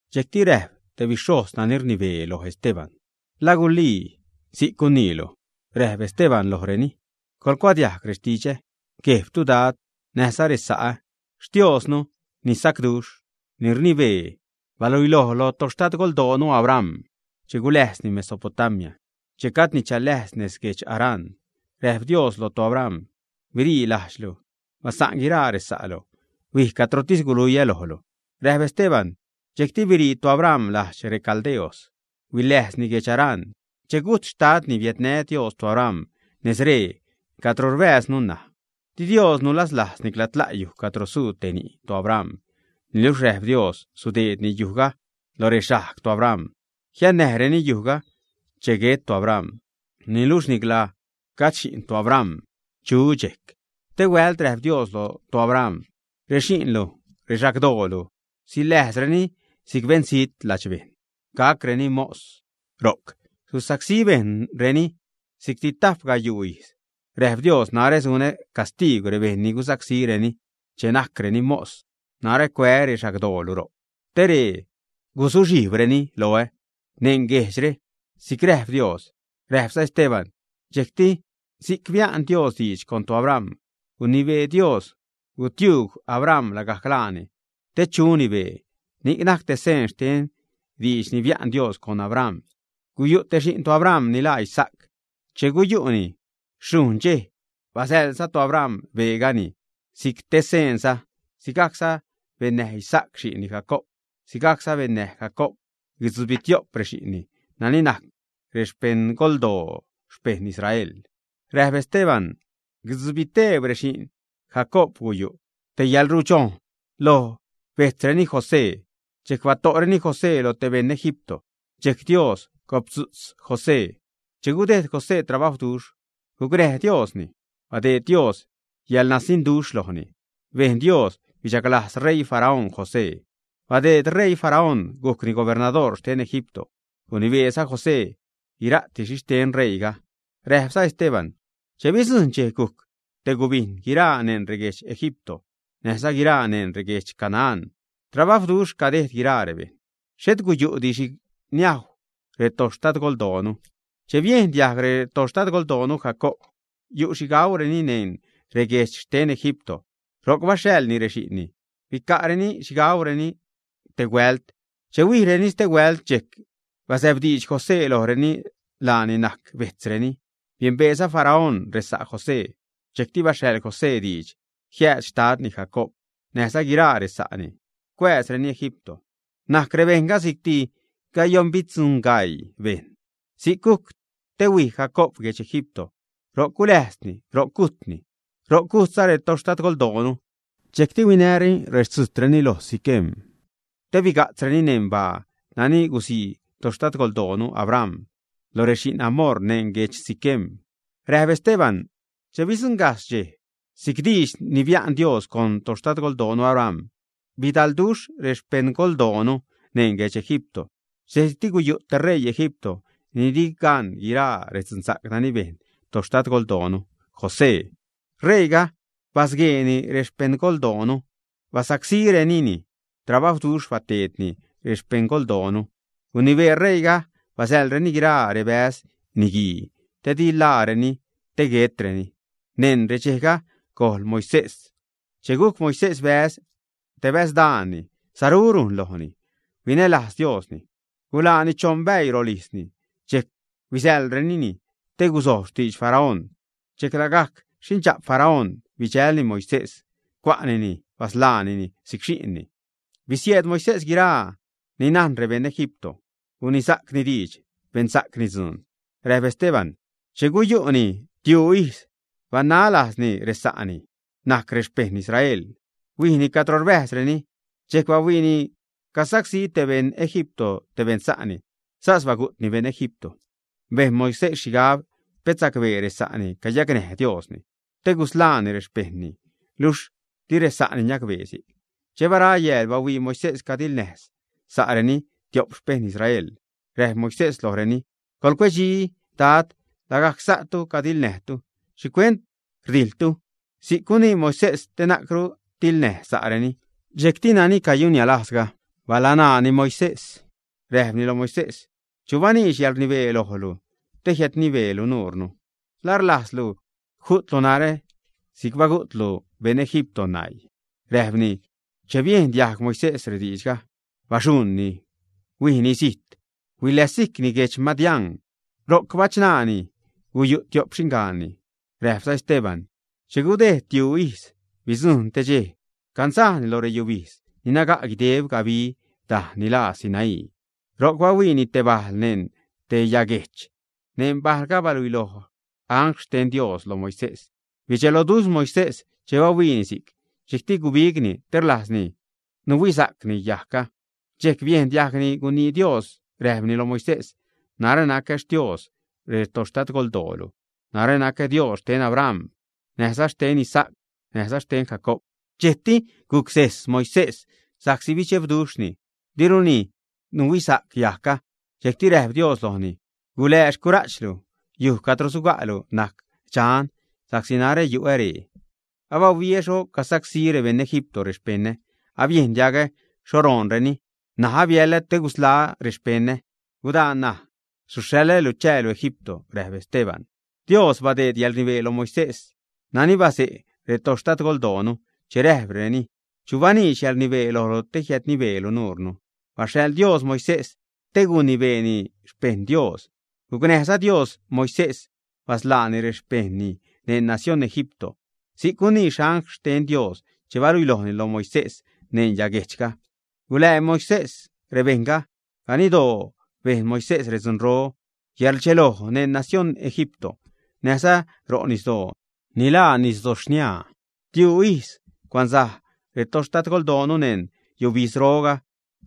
Dxejcti räjp te bixhojz nani rnibee lo Esteban: ―¿La gulii si'c guniilu, ä? Räjp Esteban lojreni: ―Coḻgucuadiajg rextidxä, guejbtu dad, näjza resa'ä. Xtioznu ni sacduxh, ni rnibee, baluiloj lo toxtadgoldoonu Abram che guläjzni Mesopotamia, che gajdni chaläjz neṉ guedx Harán. Räjp Dios loj toAbram: “Birii lajdxtu, basa'n guiraa resa'lu. Huij cadrotis guluiä lojlu” ―räjp Esteban―. Dxejcti birii toAbram lajdx reCaldeos. Huiläjzni guedx Harán. Che gujt xtadni, biädnä Dios toAbram nez ree, cadro rbääznu ṉaj. Di Dios nuzalajz nicla tla' yuj cadro suu te ni' toAbram. Niluxh räjp Dios sudeedni yujga lo rexajg toAbram, jiannäjreni yujga che guet toAbram. Niluxh nicla gajd xi'n toAbram chu dxejc. Stee huält räjp Dios lo toAbram: “Rexi'nlu, rexagdoolu, siläjzreni si'c beṉzijt. Ladxbejṉ gacreni mos, ro'c susacsí bejṉreni si'cti tajp gayuu ijz.” Räjp Dios: “Narä sunä castiigw rebejṉ ni gusacsíreni che najcreni mos. Narä cuää́ rexagdoolu ro'c, te ree guzuxhijbreni loä neṉ guejdxre”, si'c räjp Dios ―räjpza Esteban―. Dxejcti si'c bia'n Dios diidx con toAbram, gunibee Dios gutiuug Abram lagajc laani, te chuni bee; ni'c najc te seen xten diidx ni bia'n Dios con Abram. Guyu' te xi'n toAbram, ni laa Isaac. Che guyu'ni xhujṉ dxej, basäḻza toAbram beegani si'c te seenza. Sigajcza bennäj Isaac xi'nni Jacoob. Sigajcza bennäj Jacoob guitzubitio'p rexi'nni nani najc rexpeṉgoldoo xpeṉ Israel. Räjp Esteban: ―Guitzubiteb rexi'n Jacoob guyu' te yälrudxojn lo bejtzreni José. Dxejc bato'reni José lo te beṉ Egipto. Dxejc Dios goptzu'tz José. Che gudejd José trabajwduxh, gucnäj Diosni. Badeed Dios yäḻnasiṉduxh lojni. Bejn Dios bichaglajz ṟeii Faraón José. Badeed ṟeii Faraón gujcni gubernadoor xten Egipto. Gunibeeza José guira'ti xhixten ṟeiiga. Räjpza Esteban: ―Che bidzujṉ dxej gujc te gubijn, guiraa neṉ reguedx Egipto näjza guiraa neṉ reguedx Canaán, trabajwduxh cadejd guiraa rebejṉ. Xhet guyu'di xhi niajw retoxtadgoldoonu. Che biejn diajg xtadgoldoonu Jacoob yu' xhi gaureni neṉ reguejdx xten Egipto, ro'c baxhaḻni rexi'nni, bica'reni xhi gaureni te huält. Che huijreni stehuält, dxejc bazäbdiidx José lojreni laani najc bejtzreni. Biembeeza Faraón resa' José. Dxejcti baxhaḻ José diidx jiääd xtadni Jacoob, näjza guiraa resa'ni, cuääzreni Egipto. Najc rebejṉga si'cti gayoṉbitzubigaii bejṉ. Si'c gujc te huij Jacob guedx Egipto. Ro'c guläjzni, ro'c gujtni. Ro'c gujtza retoxtadgoldoonu. Dxejcti huinäreni rextzujtreni loj Siquem te biga'tzsacreni neṉ baa nani gusii toxtadgolnu Abram lo rexi'n Hamor neṉ guedx Siquem. Räjp Esteban: ―Che bidzuṉgajxh dxej, si'c diidx ni bia'n Dios con toxtadgoldoonu Abram, bidalduxh rexpeṉgoldoonu neṉ guedx Egipto. Dxejcti guyu' te xṟeii Egipto ni di gan guiraa redzunsa'c nani bejn toxtadgoldoonu José. R̲eiiga basgueeni rexpeṉgoldoonu, basacsínireni, trabajwduxh bateedni rexpeṉgoldoonu. Gunibee ṟeiiga basäḻreni guiraa rebäz niguii te di ḻaareni, te guetreni. Neṉ redxejga, gojl Moisés. Che gujc Moisés bäz, te bäz daani, saru rujn lojni, huinälajz Diosni. Guḻaani choṉ bäii rolijzni. Dxejc huisäḻrenini, te guzojb xtidx Faraón. Dxejc lagajc xindxa'p Faraón bidxälni Moisés, cua'nini basḻaanini si'c xi'nni. Bisieed Moisés guiraa ni najn rebeṉ Egipto. Gunisa'cni diidx, bensa'cni dzuun. Räjp Esteban: ―Che guyu'ni tiuu ijz, banaj lajzni resa'ni ni najc xpejṉ Israel, huijni cadro rbäjzreni. Dxejc bahuiini casacsí te beṉ Egipto te beṉ sa'ni. Sas bagu'tni beṉ Egipto. Bejn Moisés xhigab pet sacbee resa'ni cayacnäj Diosni te gusḻaani rexpejṉni. Luxh di resa'ni niacbee si'c. Che bara yääl, bahuii Moisés cadiḻnäj sa'reni tiop xpeṉ Israel. Räjp Moisés lojreni: “Coḻcuedxi, Dad. Lagajc sa'tu cadiḻnäjtu. ¿Xhicuent rdijḻtu?” si'c gunii Moisés, te na'cru tiḻnäj sa'reni. Dxejcti nani cayunniälajzga, balanaani Moisés, räjpni loj Moisés: “¿Chu baniidx yäḻrnibee lojlu te jiädnibeelu nuure? ¿La rlajzlu ju'tlu narä si'c bagu'tlu beṉ Egipto naii?” ―räjpni―. Che biejn diajg Moisés rediidxga, baxuṉni, huijni zijt. Huiläzsijcni guedx Madián. Ro'c bachṉaani, guyu' tiop xiṉgaanni. Räjpza Esteban: ―Che gudejd tiuu ijz, bidzujṉ te dxej cansajni nez lo reyubijdz ni naga' guideb gabi dajn ni ḻaa Sinaí. Ro'c bahuiini te bajl neṉ te yaguejch. Neṉ bajlga baluiloj angl xten Dios lo Moisés. Bidxeloduxh Moisés che bahuiini si'c. Dxejcti gubigni te rlajzni nuhuisa'cni yajgga. Dxejc biejn diajgni gunii Dios, räjpni lo Moisés: “Narä nacä Xtios rextadgoldoolu, narä nacä Dios xten Abram, näjza xten Isaac näjza xten Jacoob.” Dxejcti gucsez Moisés sa'csi bidxebduxhni, diruni nuhuisa'c yajgga. Dxejcti räjp Dios lojni: “Gulää xcura'chlu. Yuj cadro suga'lu najc dxan, sa'csi narä yu'ä ree. Abahuiä xho cagusacsí rebeṉ Egipto rexpeṉä. Abiejn diagä xho roonreni. N̲aj abiälä te gusḻaä́ rexpeṉä. Gudaa ṉaj, suxhaḻälu chäälu Egipto.” Räjp Esteban: ―Dios badeed yäḻrnibee lo Moisés nani baze' retoxtadgoldoonu che räjpreni: “¿Chu baniidx yäḻrnibee lojlu te jiädnibeelu nuure?” Baxhaḻ Dios Moisés te guinibeeni xpejṉ Dios, gucnäjza Dios Moisés basḻääni rexpejṉni neṉ nacióṉ Egipto si'c gunii angl xten Dios che baluilojni lo Moisés neṉ yaguejchga. Gulää Moisés rebejṉga. Ganiddoo bejn Moisés redzunro, yäḻrdxeloj neṉ nacióṉ Egipto näjza ro' nisdoo ni laa nisdo xniaa. Tiuu ijz cuansaj retoxtadgoldoonu neṉ yubijdzroga,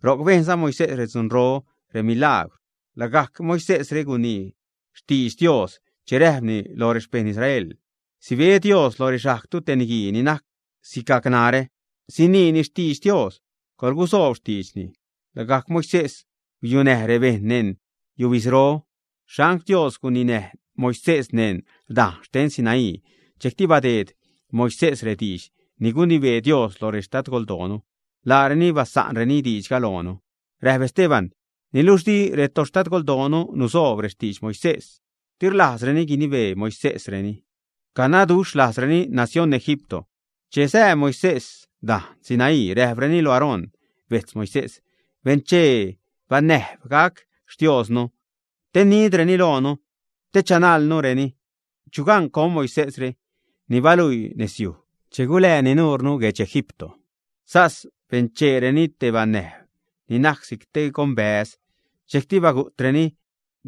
ro'c bejnza Moisés redzunro, remilagwr. Lagajc Moisésre gunii xtidx Dios che räjpni loj rexpejṉ Israel: “Sibe Dios lo rexajgtu te niguii ni najc sigac narä. Siniini xtidx Dios. Coḻgusoob xtiidxni.” Lagajc Moisés guyunäj rebejṉ neṉ yubidzro. Xangl Dios guninäj Moisés neṉ dajn xten Sinaí. Dxejcti badeed Moisés rediidx ni gunibee Dios lo retoxtadgoldoonu. Laareni basa'nreni diidxga loonu. Räjp Esteban: ―Niluxh di retoxtadgoldoonu nusoob rextidx Moisés. Di rlajzreni guinibee Moisésreni. Canaduxhlajzreni nacióṉ Egipto. Che sää Moisés dajn Sinaí, räjpreni loj Aarón bejtz Moisés: “Benchee banäjb gac xtiooznu, te nidreni loonu, te chanajlnureni. Chu gan con Moisésre ni baluii nezyuj che gulääni nuure guejdx reEgipto.” Sas bencheereni te banäjb ni najc si'c te gonbäz. Dxejcti bagu'treni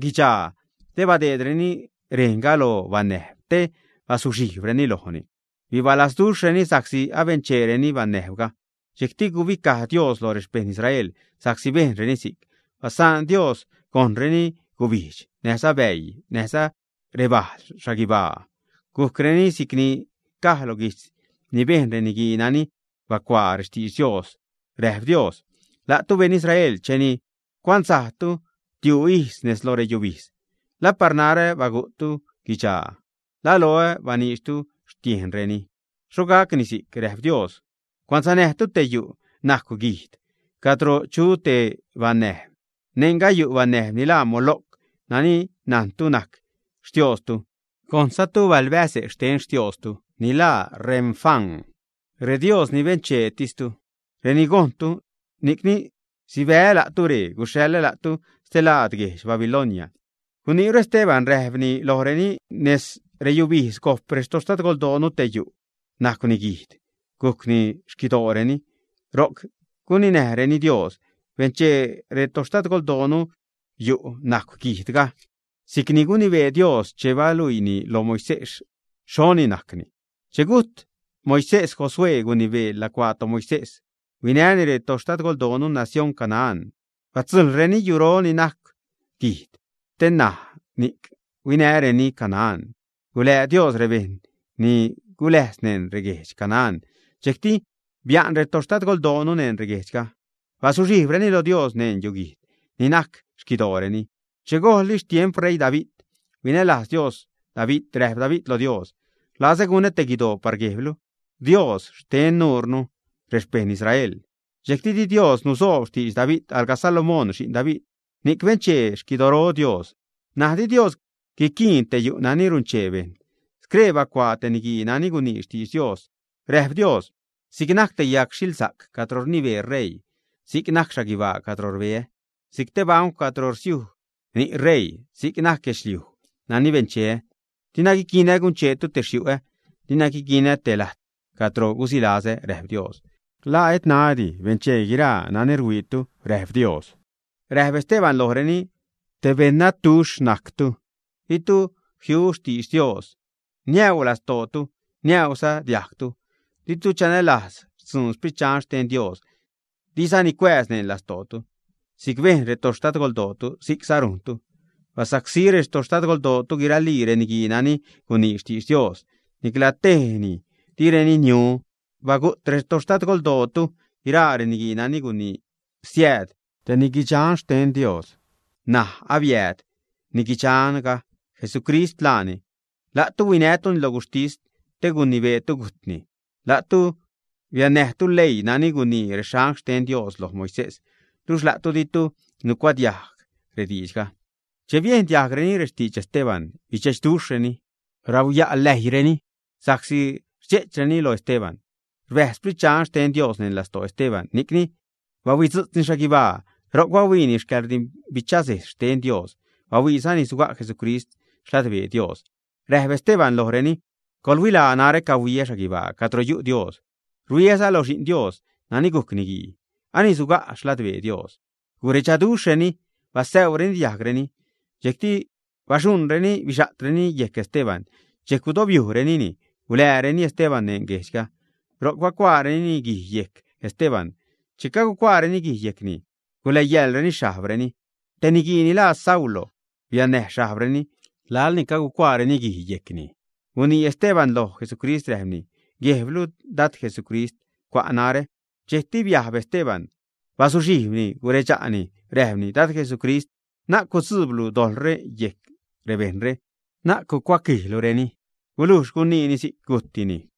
guidxaa te badeedreni rejnga lo banäjb te bazuxhijbreni lojni. Bibalazduxhreni sa'csi abencheereni banäjbga. Dxejcti gubicaj Dios loj rexpejṉ Israel sa'csi bejnreni si'c. Basaan Dios gojṉreni gubijdx, näjza bäii, näjza rebal xhaguibaa. Gujcni si'cni caj lo guijtz ni bejn reniguii nani bacuaa rextidx Dios. Räjp Dios: La'tu beṉ Israel, cheni cuansajtu tiuu ijz nez lo reyubijdz, ¿la par narä bagu'ttu guidxaa, ä? ¿La loä baniidxtu xtiejnreni, ä? Xho gacni si'c, räjp Dios. Cuansanäjtu te yu' najcw guijd cadro chu te banäjb. Neṉga guyu' banäjb ni laa Moloc, nani najtu najc xtiostu. Gojṉzatu balbäze' xten xtiostu ni laa Remfán. Redios ni bencheetistu reni'c gojṉtu. Ni'cni sibää́ la'tu ree guxhaḻä la'tu stelaad guedx Babilonia. Guniiru Esteban, räjpni lojreni: ―Neṉ reyubijdz gojp retoxtadgoldoonu te yu' najcwni guijd. Gujcni xquidooreni. Ro'c guninäjreni Dios. Benchee retoxtadgoldoonu yu' najcw guijdga si'cni gunibee Dios che baluiini lo Moisés xhoni gacni. Che gujt Moisés, Josué gunibee lacuaa toMoisés, huinäni retoxtadgoldoonu nacióṉ Canaán. Batzujḻreni yuro ni najcw guijd te näj ni'c huinäreni Canaán. Gulää Dios rebejṉ ni guläjz neṉ reguedx Canaán. Dxejcti bia'n retoxtadgoldoonu neṉ reguejdxga. Bazuxhijbreni lo Dios neṉ yuguijd ni najc xquidooreni che gojlli xtiemp ṟeii David. Huinälajz Dios David. Räjp David lo Dios: “Rlazä gunä te guidoo par guejblu, Dios xten nuure, rexpejṉ Israel.” Dxejcti di Dios nusoob xtidx David. Alga Salomón, xi'n David, ni'c benchee xquidoro Dios. N̲aj di Dios guiquiin te yu' nani runchee bejṉ. Scree bacuaa te niguii nani gunii xtidx Dios. Räjp Dios: Si'c najc te yagxhilsa'c cadro rnibee ṟeii, si'c najc xhaguibaa cadro rbeä. Si'c te bancw cadro rsiuj ni' ṟeii, si'c najc guedxliuj nani bencheä. Dina guiquinä guncheetu te xyu'ä. Dina guiquinä te lajt cadro gusilazä, räjp Dios. ¿La et ṉaädi benchee guiraa nani ruhuiitu?, räjp Dios. Räjp Esteban lojreni: ―Te beṉ nadduxh najctu. Ditu jiu xtidx Dios. Niäu lastootu, niäuza diajgtu. Di'tu chanälajz xtzuun Sprit Dxan xten Dios, dizani cuääz neṉ lastootu. Si'c bejṉ retoxtadgoldootu, si'cza rujntu. Basacsí retoxtadgoldootu guiralii reniguii nani gunii xtidx Dios. Nicla tejni direni niu. Bagu't retoxtadgoldootu guiraa reniguii nani gunii siääd te niguidxan xten Dios. N̲aj abiääd niguidxanga, Jesucrist laani, luxh la'tu huinätuni lo guxhtis te gunibeetu gujtni. La'tu biannäjtu leii nani gunii reangl xten Dios loj Moisés, luxh la'tu ditu nucuadiajg rediidxga. Che biejn diajgreni rextidx Esteban, bidxe'chduxhreni, rauya' läijreni sa'csi rdxe'chreni lo Esteban. Rbäjz Sprit Dxan xten Dios neṉ lastoo Esteban, ni'cni bahuitzu'tzni xhaguibaa, ro'c bahuiini yäḻrdimbichasejz xten Dios. Bahuiizani suga' Jesucrist xladbee Dios. Räjp Esteban lojreni: ―Coḻhuilaa. Narä cahuiä xhaguibaa cadro yu' Dios, ruhuiäza loj Xi'n Dios nani gujc Niguii; ani suga' xladbee Dios. Guredxaduxhreni basäuzareni diajgreni. Dxejcti baxuṉreni bixa'treni yejc Esteban. Dxejc gudobyujrenini, guḻääreni Esteban neṉ guejdxga. Ro'c bacuaareni guij yejc Esteban. Che cagucuaareni guij yejcni, guläyaḻreni xhajbreni; te niguii ni laa Saulo biannäj xhajbreni. Laḻ ni cagucuaareni guij yejcni, gunii Esteban loj Jesucrist räjpni: ―Guejblu, Dad Jesucrist, cua' narä. Dxejcti biajb Esteban, bazuxhijbni, guredxa'ni räjpni: ―Dad Jesucrist, na'c gudzuublu dojḻre yejc rebejṉre, na'c gucuaquijlureni. Gulujxsi guniini si'c, gujtni.